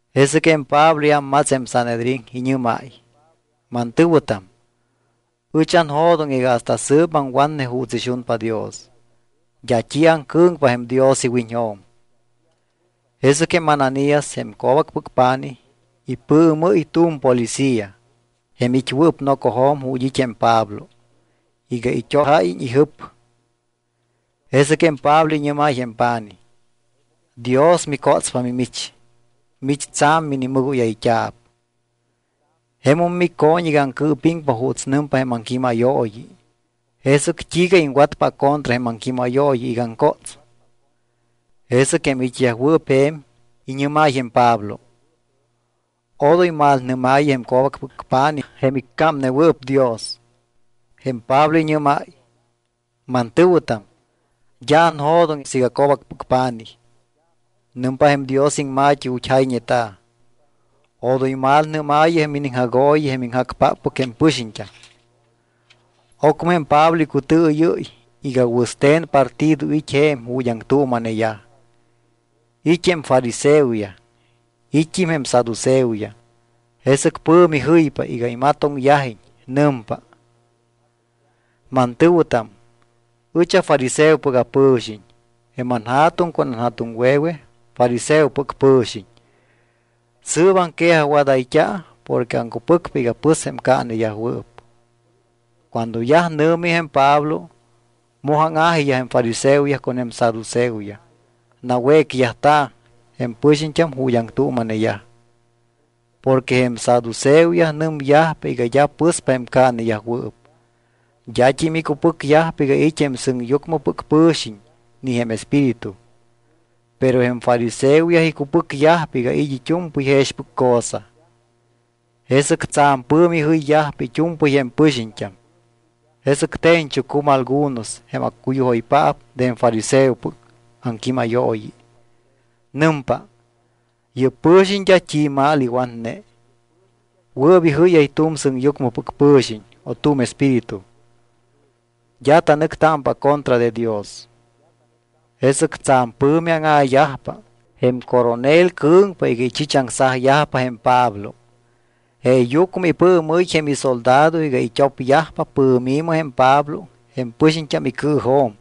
Jesɨc jém Pablo iámmats jém Sanhedrín, iñɨ́máy: —Mantɨ̱wɨtam, ɨch anjo̱doŋ iga hasta sɨɨp aŋwatne juuts ixunpa Dios. D́a t́i aŋcɨ̱ŋpa jém Dios iwiñjo̱m. Jesɨc jém Ananías, jém co̱bacpɨc pa̱nij, ipɨɨmɨ́y tu̱m policía, jém it́wɨɨp nocojo̱m ju̱t́ it́ jém Pablo, iga it́ojáyiñ ijɨp. Jesɨc jém Pablo iñɨ́máy jém pa̱nij: —Dios micótspa mimich. Mich tsa̱m minimɨgóyayt́a̱p. Jemum mico̱ñ iga aŋcɨɨpiŋpa juuts nɨmpa jém aŋquímayooyi, ¿jesɨc t́iiga iŋwatpa acontra jém aŋquímayooyi iga aŋcóts? Jesɨc jém it́yajwɨɨp je̱m iñɨ́máy jém Pablo: —Odoy malnɨ́maayɨ jém co̱bacpɨc pa̱nij jém iccámnewɨɨp Dios. Jém Pablo iñɨ́máy: —Mantɨ̱wɨtam, d́a anjo̱doŋ siiga co̱bacpɨc pa̱nij. Nɨmpa jém Dios iŋma̱t́i ju̱t́ jayñeta̱: “Odoy malnɨ́maayɨ jém iniŋjagooyi jém iŋjacpáppɨc jém pɨxiñt́am.” Ocmɨ jém Pablo icutɨɨyɨ́y iga wɨste̱n partido it́ je̱m ju̱t́ aŋtuuma̱neyaj. It́ jém fariseoyaj, it́t́im jém saduceoyaj. Jesɨc pɨ̱mi jɨypa iga imatoŋyajiñ. Nɨmpa: —Mantɨ̱wɨtam, ɨch afariseopɨc apɨ̱xiñ. Jém anja̱tuŋ con anja̱tuŋwe̱we fariseopɨc pɨ̱xiñ. Sɨɨp aŋquejajwadayt́a̱ porque aŋcupɨcpa iga pɨspa jém caaneyajwɨɨp. Cuando yaj nɨ̱mi jém Pablo, moj áŋa̱jiyaj jém fariseoyaj con jém saduceoyaj. Nawécyajta̱ jém pɨxiñt́am ju̱t́ aŋtuuma̱neyaj. Porque jém saduceoyaj nɨmyajpa iga d́a pɨspa jém caaneyajwɨɨp. D́at́im icupɨcyajpa iga it́ jém sɨŋyucmɨ pɨxiñt́am ni jém espíritu, pero jém fariseoyaj icupɨcyajpa iga it́ it́u̱mpɨy jexpɨc cosa. Jesɨc tsa̱m pɨ̱mi jɨyyajpa it́u̱mpɨy jém pɨxiñt́am. Jesɨc te̱ñchucum algunos jém accuyujoypaap de jém fariseopɨc aŋquímayooyi. Nɨmpa: —Yɨ́p pɨ̱xiñ d́a t́i mal iwatne. Wɨɨp ijɨ́yáy tu̱m sɨŋyucmɨpɨc pɨ̱xiñ o tu̱m espíritu. D́a tanɨctámpa acontra de Dios. Jesɨc tsa̱m pɨ̱mi áŋa̱yajpa. Jém coronel cɨ̱ŋpa iga ichichaŋsajyajpa jém Pablo. Jeeyucmɨ ipɨɨmɨ́y jém isoldado iga it́opyajpa pɨ̱mi̱mɨ jém Pablo jém pɨxiñt́am icɨɨjo̱m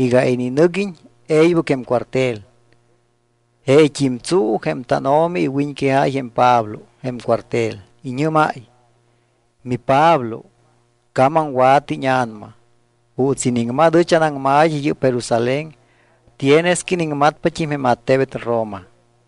y iga ininɨguiñ e̱ybɨc jém cuartel. Jeet́im tsuu jém tánO̱mi iwiñquejáy jém Pablo jém cuartel. Iñɨ́máy: —MiPablo, camamwa̱tɨ íña̱nama. Juuts iniŋmat ɨch anaŋma̱t́i yɨ́p Jerusalén tienes que iniŋmatpat́im jém attebet Roma.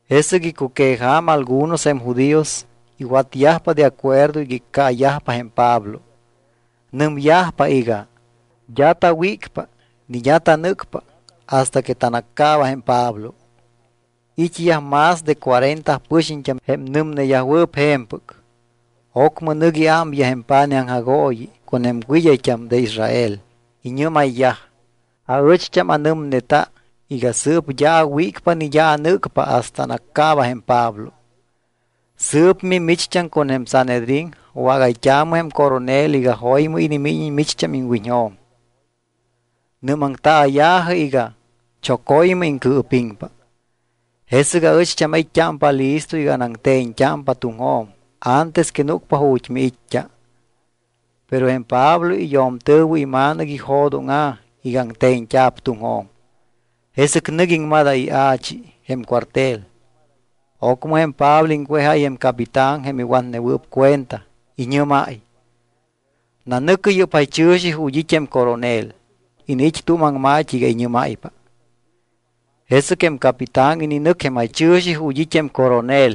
Jesɨc icuqueja̱ma algunos jém judíos iwatyajpa de acuerdo iga iccaayajpa jém Pablo. Nɨmyajpa iga: “D́a tawícpa ni d́a tanɨ́cpa hasta que tanaccaaba jém Pablo.” It́yaj más de cuarenta pɨxiñt́am jém nɨmneyajwɨɨp je̱mpɨc. Ocmɨ nɨc iámyaj jém pa̱nij aŋjagooyi con jém wɨd́ayt́am de Israel. Iñɨ́mayyaj: —Aɨcht́am anɨmneta iga sɨɨp d́a awícpa ni d́a anɨ́cpa hasta anaccaaba jém Pablo. Sɨɨp mimicht́am con jém Sanhedrín wágayt́aamɨ jém coronel iga jo̱ymɨ inimíñiñ micht́am iŋwiñjo̱m. Nɨ́maŋtaaya̱jɨ iga choco̱ymɨ iŋcɨɨpiŋpa. Jesɨc aɨcht́am ait́t́ámpa listo iga anaŋte̱ñt́ámpa tuŋjo̱m antes que núcpa ju̱t́ miit́t́a. Pero jém Pablo iyo̱mtɨ̱wɨ ima̱nɨc ijo̱dóŋa̱ iga aŋte̱ñt́a̱p tuŋjo̱m. Jesɨc nɨc iŋmadáy ia̱chi jém cuartel. Ocmɨ jém Pablo iŋwejáy jém capitán jém iwatnewɨɨp cuenta. Iñɨ́máy: —Nanɨ̱cɨ yɨ́p jaychɨ̱xi ju̱t́ it́ jém coronel. Iniit́ tu̱m aŋma̱t́i iga iñɨ́máypa. Jesɨc jém capitán ininɨc jém jaychɨ̱xi ju̱t́ it́ jém coronel,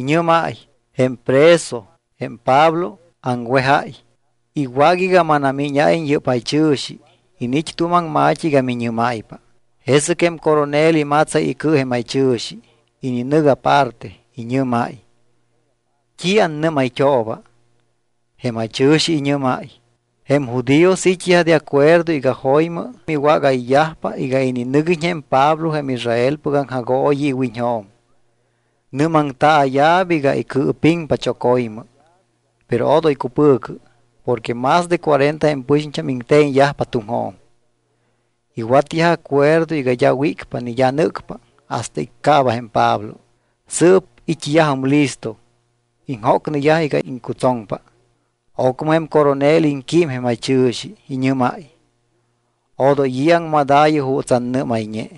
iñɨ́máy: —Jém preso, jém Pablo, aŋwejáy. Iwác iga manamíñáyiñ yɨ́p jaychɨ̱xi. Iniit́ tu̱m aŋma̱t́i iga miñɨ́máypa. Jesɨc jém coronel imatsáy icɨ jém jaychɨ̱xi. Ininɨc aparte. Iñɨ́máy: —¿T́i annɨ́mayt́ooba? Jém jaychɨ̱xi iñɨ́máy: —Jém judíos it́yaj de acuerdo iga jo̱ymɨ miwágayyajpa iga ininɨguiñ jém Pablo jém Israelpɨc aŋjagooyi iwiñjo̱m. Nɨ́maŋtaaya̱p iga icɨɨpiŋpa choco̱ymɨ. Pero odoy cupɨ̱cɨ porque más de cuarenta jém pɨxiñt́am iŋte̱ñyajpa tuŋjo̱m. Iwatyaj acuerdo iga d́a wícpa ni d́a nɨ́cpa hasta iccaaba jém Pablo. Sɨɨp it́yajum listo. Iŋjócneyaj iga iŋcutsoŋpa. Ocmɨ jém coronel iŋquím jém jaychɨ̱xi, iñɨ́máy: —Odoy i̱ aŋmadaayɨ juuts annɨ́mayñe.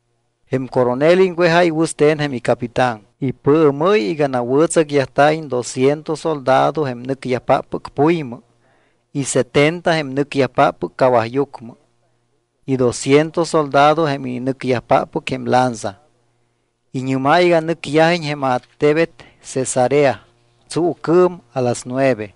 Jém coronel iŋwejáy wɨste̱n jém icapitán. Ipɨɨmɨ́y iga nawɨ̱tsacyajta̱iñ dosciento soldado jém nɨcyajpáppɨc puymɨ y setenta jém nɨcyajpáppɨc cawajyucmɨ y dosciento soldado jém ininɨcyajpáppɨc jém lanza. Iñɨ́máy iga nɨcyajiñ jém attebet Cesarea tsuucɨɨm a las nueve.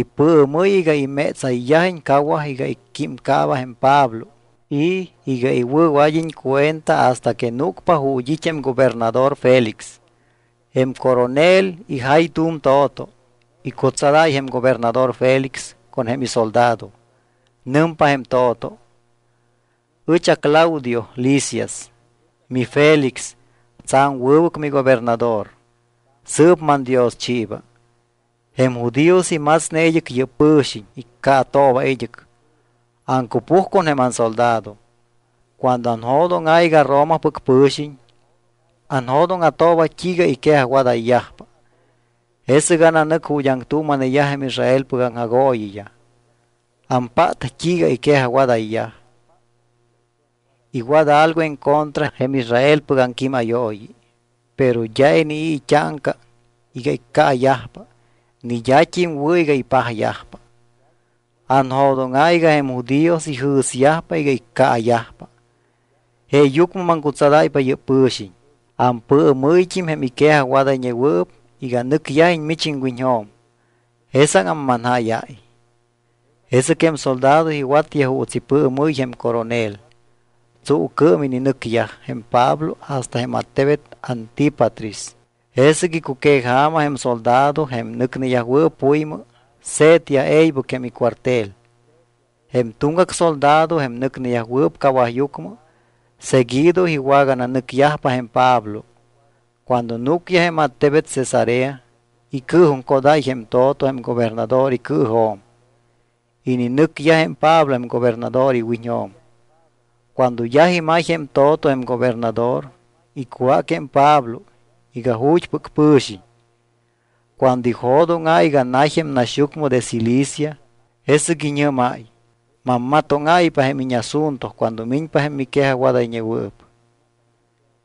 Ipɨɨmɨ́y iga imétsayyajiñ cawaj iga icquímcaaba jém Pablo y iga iwɨ̱wad́iñ cuenta hasta que núcpa ju̱t́ it́ jém gobernador Félix. Jém coronel ijay tu̱m to̱to, icutsadáy jém gobernador Félix con jém isoldado. Nɨmpa jém to̱to: “Ɨch aClaudio Lisias. MiFélix, tsa̱m wɨbɨc migobernador. Sɨɨp mandioschiiba. Jém judíos imatsne id́ɨc yɨ́p pɨ̱xiñ. Iccaatooba id́ɨc. Aŋcupuj con jém ansoldado. Cuando anjo̱dóŋa̱ iga Romapɨc pɨ̱xiñ, anjo̱dóŋa̱tooba t́iiga iquejajwadayyajpa, jesɨc ananɨc ju̱t́ aŋtuuma̱neyaj jém Israelpɨc aŋjagooyiyaj. Ampát t́iiga iquejajwadayyaj. Iwat algo en contra jém Israelpɨc aŋquímayooyi. Pero d́a inii̱ it́áŋca iga iccaayajpa ni d́at́im wɨ̱ iga ipajyajpa. Anjo̱dóŋa̱ iga jém judíos ijɨ̱syajpa iga iccaayajpa. Jeeyucmɨ maŋcutsadáypa yɨ́p pɨ̱xiñ. Ampɨɨmɨ́yt́im jém iquejajwadayñewɨɨp iga nɨcyajiñ mich iŋwiñjo̱m. Jesáŋam manjáyáy.” Jesɨc jém soldado iwatyaj juuts ipɨɨmɨ́y jém coronel. Tsuucɨɨm ininɨcyaj jém Pablo hasta jém attebet Antípatris. Jesɨc icuqueja̱ma jém soldado, jém nɨcneyajwɨɨp puymɨ, se̱tyaj e̱ybɨc jém icuartel. Jém tuŋgac soldado, jém nɨcneyajwɨɨp cawajyucmɨ, seguido iwagananɨcyajpa jém Pablo. Cuando núcyaj jém attebet Cesarea, icɨɨjuŋcodáy jém to̱to jém gobernador icɨɨjo̱m. Ininɨcyaj jém Pablo jém gobernador iwiñjo̱m. Cuando yaj imay jém to̱to jém gobernador, icwác jém Pablo iga ju̱t́pɨc pɨ̱xiñ. Cuando ijo̱dóŋa̱ iga nay jém naxyucmɨ de Cilicia, jesɨc iñɨ́máy: —Mammatóŋáypa jém íñasunto cuando miñpa jém miquejajwadayñewɨɨp.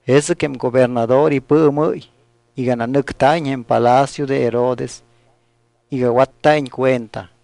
Jesɨc jém gobernador ipɨɨmɨ́y iga nanɨcta̱iñ jém palacio de Herodes iga watta̱iñ cuenta.